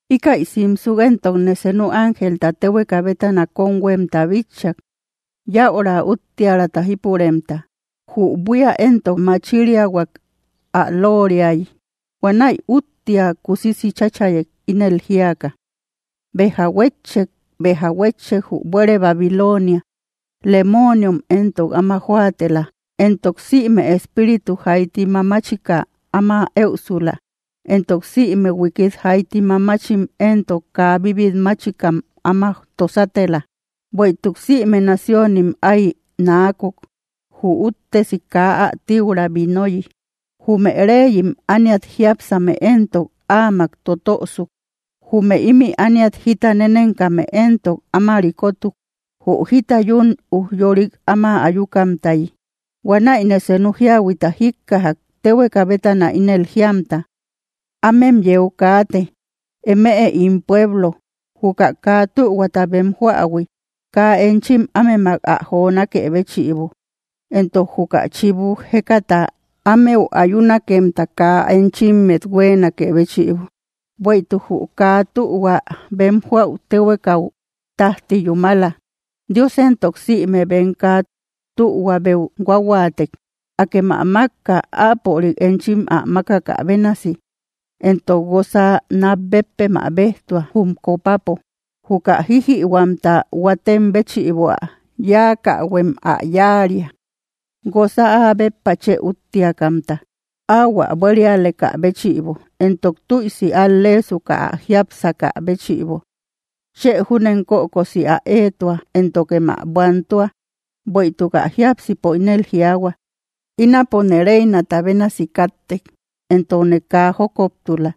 Íkäi simsuk éntokne senu ángelta téhueka bétana kóm huémta bitchak, yäura úttiäraata jípuremta. Jü buía éntok ä machiriahuak ä looriayi. Huanäi úttia kusisi cháchayek, ínel jíaka: —¡Béja huétchek! ¡Béja huétchek, jü buére Babilonia! Lemooniom éntok áma jóatela, entok sïme espíritu jaiti mamachika áma éusula, entok sïme huikit jaiti mamachim entok kaa bíbit máchikam áma tosatela. Bueïtuk sïme naciónim ái naakok, jü úttesi kaa ä tiura vinoyi. Jume reyim ániat jiápsame éntok áamak totösuk. Jume ímï ániat jita nenenkame éntok áma rikotuk, jü jita yún ujyorik áma ayukamtayi. Huanäine senu jíahuita jíkkajak, téhueka bétana ínel jiamta: —Ámem yeu kaate, eme ín pueblo, juka kaa tühuata bem joähui kaa enchim ámemak ä jonákë béchïbo, entok juka chibu jékata ámeu ayunakemta kaa enchimmet huéenakë béchïbo. Bueïtuk jü kaa tühua bem joäu téhuekau tájti yúmala; Dios éntok sïme bem kaa tühuabeu huahuaatek. Akem ä mákka, áapörik enchim ä mákakä bénasi, entok guosa nat béppem ä béjtua, jum copapo. Juka jijïhuamta huatem béchïbo ä yáakähuem ä yáaria, guosa áa béppa chë úttiakamta. Ahuä buérialekä béchïbo, entok tüisi al‑leesuka ä jiápsakä béchïbo, chë júnem kökosi ä éetua éntokem ä buantua; bueïtuk ä jiápsipo ínel jiaahua: “Ínapone reinata bénasi káttek, entokne kaa jókoptula,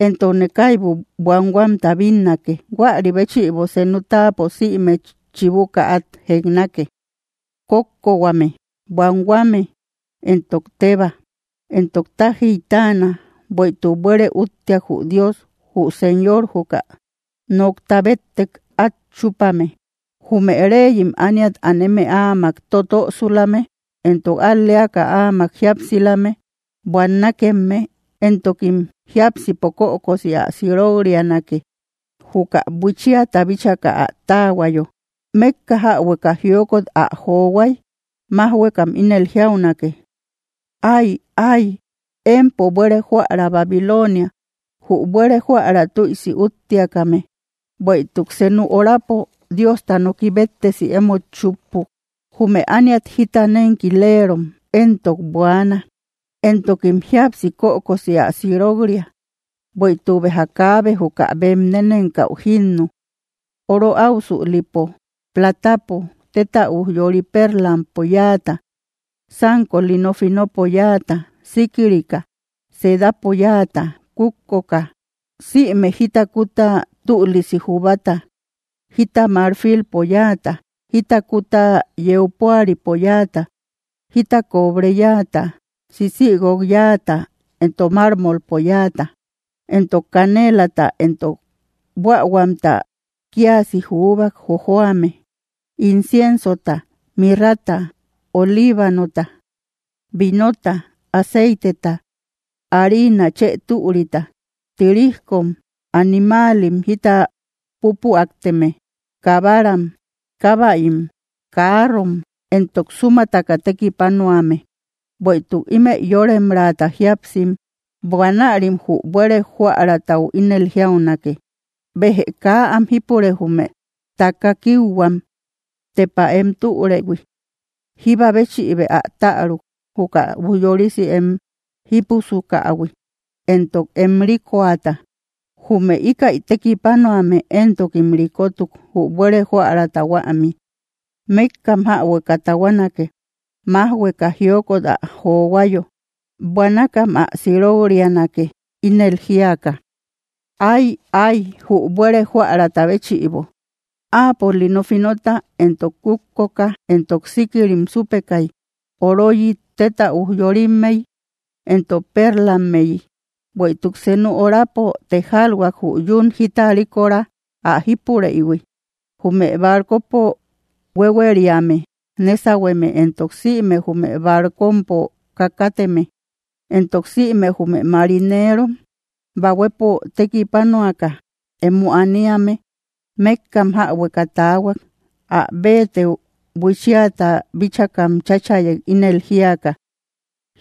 entokne kaibu buanhuamta bínnake.” Huarï béchïbo senu táapo sïme chibuka át jeknake: kókkohuame, buanhuame, entok tébaa. Entok tájiy táana, bueïtuk buére úttiak jü Dios, jü Señor juka nokta béttek át chúpame. Jume reyim ániat aneme áamak totösulame entok al‑leaka áamak jíapsilame buannakemme; entokim jiápsipo kökosi ä sirok‑rianake, juka buichiata bíchaka ä táahuayo. Mékka jäbueka jiokot ä johuay májhuekam ínel jiaunake: —¡Ay, ay! ¡Empo buére jóära Babilonia, jü buére jóära tüisi úttiakame! ¡Bueïtuk senu horapo Diosta noki béttesi emót chúppuk! Jume ániat jita nénkilerom éntok buaana, entokim jíapsi kökosi ä sirok‑ria, bueïtuk béja kaabe juka bem nénenkäu jínnu: oro áusülipo, platapo, téta ujyori, perlampo yáata, sánko lino finopo yáata, síkirika, sedapo yáata, kútkoka, sïme jita kúta tülisi jubata, jita marfilpo yáata, jita kúta yeu púaripo yáata, jita cobre yáata, sisïguok yáata, entok mármolpo yáata, entok canelata entok buähuamta kíasi jubak jojoame, inciensota, mirrata, olibanota, vinota, aceiteta, harina chë türita, tirijkom, animaalim jita pupüateme, kabaram, kábäim, carrom, entok súmataka tekipanuame, bueïtuk ímëi yóremraata jíapsim. Huanärim jü buére jóäratau ínel jiaunake: —¡Béjë kaa am jípure jume taka kiuhuam, tepa em türëhui! ¡Jíba béchïbë ä täruk, juka ujyorisi em jípusukähui, entok em rikoata! Jume íkäi tekipanuame, entokim rikotuk jü buére jóärata huämi, mékkam jäbueka tahuanake, májhueka jiokot ä johuayo. Buanakam ä sirok‑rianake, ínel jíaka: —¡Ay, ay jü buére jóärata béchïbo! ¡Áapo lino finota entok kútkok entok síkirim súpekay, oroyi, téta ujyorimmey entok pérlammeyi! ¡Bueïtuk senu horapo tejalhuak, jü yún jita rikora ä jípureïhui! Jume barcopo huéhueriame nésahueme entok sïme jume barcompo kakateme, entok sïme jume marinerom bahuepo tekipanuaka emo aniame mékkam jäbueka taahuak. Ä béetëu buichiata bíchakam cháchayek, ínel jíaka: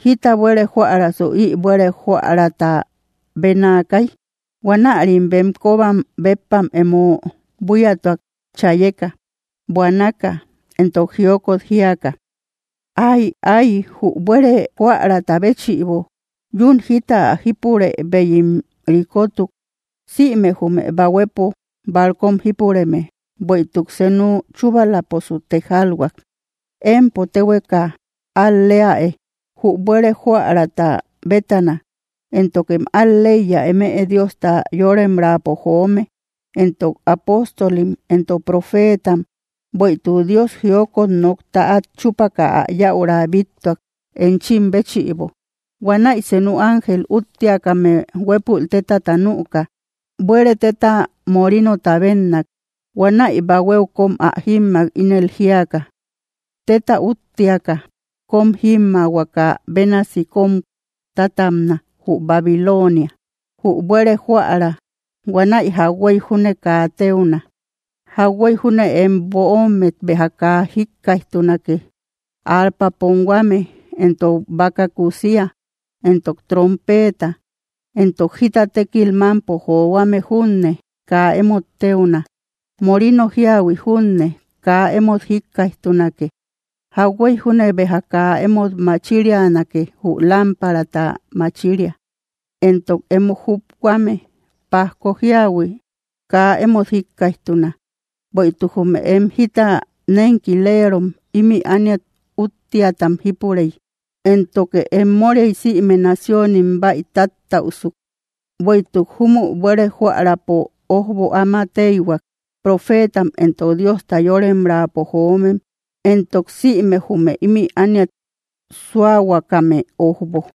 —¿Jíta buére jóärasu ï buére jóärata bénaakay? Huanärim bem kóbam béppam emo buíatuak, chayeka, buanaka entok jiokot jíaka: —¡Ay, ay jü buére jóärata béchïbo! Yún jita ä jípureïbeyim rikotuk, sïme jume bahuepo barcom jípureme. ¡Bueïtuk senu chúbalaposu tejalhuak! ’¡Empo téhueka al‑leäe, jü buére jóärata bétana! ¡Éntokem al‑leiya, eme Diosta yoremraapo joome, entok apóstolim entok profeetam! ¡Bueïtuk Dios jiokot nokta át chúpaka ä yäura bíttuak, enchim béchïbo! Huanäi senu ángel úttiakame huépul tétata nüka, buére téta morinota bénnak. Huanäi bahuéu köm ä jímmak, ínel jíaka: —¡Téta úttiaka kóm jímmaahuaka bénasi kóm tatabna, jü Babilonia, jü buére jóära! Huanäi jauhuey junne kaa téuna. Jauhuey junne em böommet béja kaa jíkkaijtunake, arpa ponhuame, entok baka kúsia, entok trompeeta. Entok jita tékil mámpo johuame junne kaa emót téuna; morino jíahui junne kaa emót jíkkaijtunake. Jauhuey junne béja kaa emót machirianake, jü lámparata machiria, entok emo jubhuame pajko jíahui kaa emót jíkkaijtuna. Bueïtuk jume em jita nenkileerom ímï ániat úttiatam jípurey, éntoke em móriay sïme naciónim, bäitattäusuk. Bueïtuk júmü buére jóärapo ójbo áma téihuak, profeetam entok Diosta yoremraapo joomem entok sïme jume ími ániat súahuakame ójbo.